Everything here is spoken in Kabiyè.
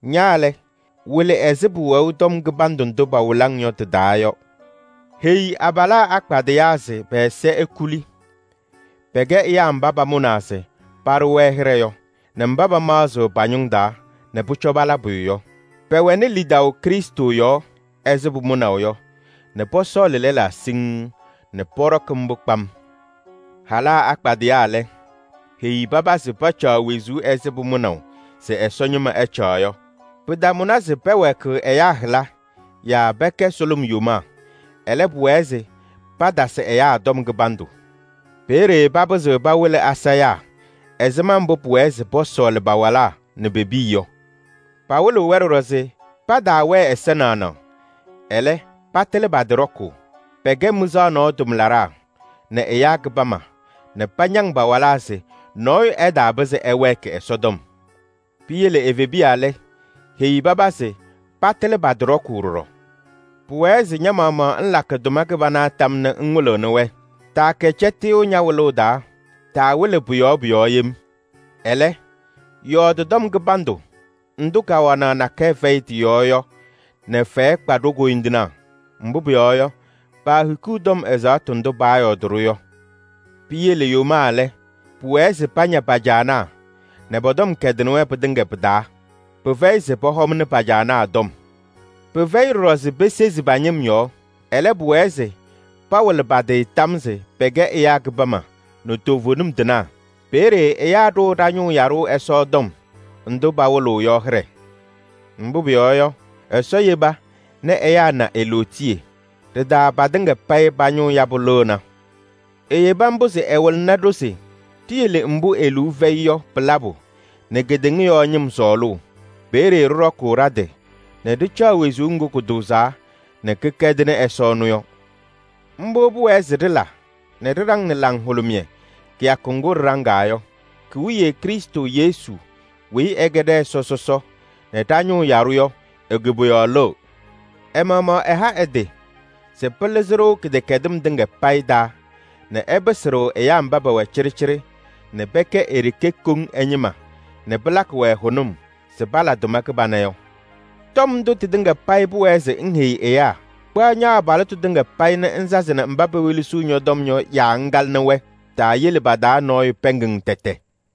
Ña lɛ, wɩlɩ ɛzɩ pʋwɛʋ tɔm kɩbandʋ ndʋ pawɩlɩ-ŋ yɔ tɩ-taa yɔ. Heyi abalaa akpadɩyaa se pɛ-ɛza ekuli. Pɛkɛ ɛyaa mba pamʋnaa se paɖʋ-wɛ hɩɖɛ yɔ nɛ mba pamaɣzɩɣ pa-ñʋŋ taa nɛ pʋcɔ pala pʋyʋ yɔ. Pɛwɛnɩ lidaʋ Krɩstʋ yɔɔ ɛzɩ pʋmʋnaʋ yɔ nɛ pɔsɔɔlɩ lɛlaa siŋŋ nɛ pɔɖɔkɩ mbʋ kpam. Halaa akpadɩyaa lɛ, heyi paba se pacaɣ wezuu ɛzɩ pʋmʋnaʋ se Ɛsɔ ñɩma ɛcaɣ yɔ. Pɩtamʋnɩ se pɛwɛɛkɩɣ ɛyaa hɩla yaa pɛkɛ sʋlʋm yomaa. Ɛlɛ, pʋwɛɛ se patasɩ ɛyaa tɔm kɩbandʋ. Peeye papɩzɩɣ pawɩlɩ asayaa ɛzɩma mbʋ pʋwɛɛ se pɔsɔɔlɩ pa-walaa nɛ pe-piya yɔ. Pawɩlɩɣ-wɛ ɖɔɖɔ se pataawɛɛ ɛza naɣnaɣ, ɛlɛ, patɩlɩ pa-tɩ ɖɔkʋʋ. Pɛkɛ mɩzaɣ nɔɔ tʋmlaɖaa nɛ ɛyaa kɩbama nɛ pañaŋ pa-walaa se nɔɔyʋ ɛtaapɩzɩ ɛwɛɛkɩ Ɛsɔtɔm. Piyele evebiya lɛ, heyi paba se patɩlɩ pa-tɩ ɖɔkʋʋ ɖɔɖɔ. Pʋwɛɛ se ña-maɣmaɣ ŋlakɩ tʋma kɩbana tam nɛ ŋwɩlɩɣnɩ-wɛ. Taakɛ cɛtɩyʋ ña-wɩlʋʋ taa, taawɩlɩ pʋ-yɔɔ pʋ-yɔɔ yem. Ɛlɛ, yɔɔdɩ tɔm kɩbandʋ ndʋ kawanaɣ nakɛyɛ fɛyɩ tɩ-yɔɔ yɔ nɛ fɛyɛ kpa ɖo-koyindinaa. Mbʋ pʋyɔɔ yɔ, paahikiɣ tɔm ɛzaɣtʋ ndʋ paayɔɔdɩ-ɖʋ yɔ. Piyele yomaa lɛ, pʋwɛɛ se paña pa-caanaa nɛ pɔ-tɔm kɛdɩnɩ-wɛ pɩtɩŋa pɩ-taa. Pɩfɛyɩ se pɔhɔmnɩ pa-caanaa tɔm. Pɩfɛyɩ ɖɔɖɔ se pesezi pa-ñɩm yɔɔ. Ɛlɛ, pʋwɛɛ se pawɩlɩ pa-tɩ tam se pɛkɛ ɛyaa kɩbama nɛ toovenim tɩnaa. Peeye ɛyaa ɖʋʋ ɖa-ñʋʋ yaɖʋ Ɛsɔ tɔm ndʋ pawɩlɩɣ yɔ hɩɖɛ. Mbʋ pʋyɔɔ yɔ, Ɛsɔ yeba nɛ ɛyaa na e-lootiye. Ɖɩ-taa patɩŋa payɩ pa-ñʋʋ yabʋ lɩɣna. Eyebi mbʋ se ɛwɩlɩɣnɩ-ɖʋ se ɖiyele mbʋ e-liu fɛyɩ yɔ pɩ-labʋ nɛ kedeŋa yɔɔ ñɩm sɔɔlʋʋ. Peeye ɖɩɖɔkʋʋ ɖa-tɩ nɛ ɖɩcaɣ wezuu ŋgʋ kʋtʋʋzaa nɛ kɩkɛdɩnɩ Ɛsɔ ɛnʋ yɔ. Mbʋ pʋwɛɛ se ɖɩla nɛ ɖɩɖaŋnɩ laŋhʋlʋmɩyɛ kɩyakʋ ŋgʋ ɖɩɖaŋaa yɔ. Ki-wiye Krɩstʋ Yesu weyi ɛkɛ ɖɛ-Ɛsɔ sɔsɔ nɛ ɖa-ñʋʋ yaɖʋ yɔ e-koboyaɣ lɩɣ. Ɛ-maɣmaɣ ɛha ɛ-tɩ se pɩlɩzɩ-ɖʋ kɩdɛkɛdɩm tɩŋa payɩ taa nɛ ɛpɩsɩ-ɖʋ ɛyaa mba pɛwɛ cɩɖɩcɩɖɩ nɛ pɛkɛ e-ɖeke koŋ ɛ-ñɩma nɛ pɩlakɩ-wɛ hʋnʋm se pala tʋma kɩbana yɔ. Tɔm ndʋ tɩtɩŋa payɩ pʋwɛɛ se ŋheyi ɛyaa. Kpaɣ ña-abalɩtʋ tɩŋa payɩ nɛ ŋsazɩnɩ mba pewelesiɣ ñɔ-tɔm yɔ yaa ŋkalɩnɩ-wɛ. Taayele pa-taa nɔɔyʋ pɛɛŋ-ŋ tɛtɛ.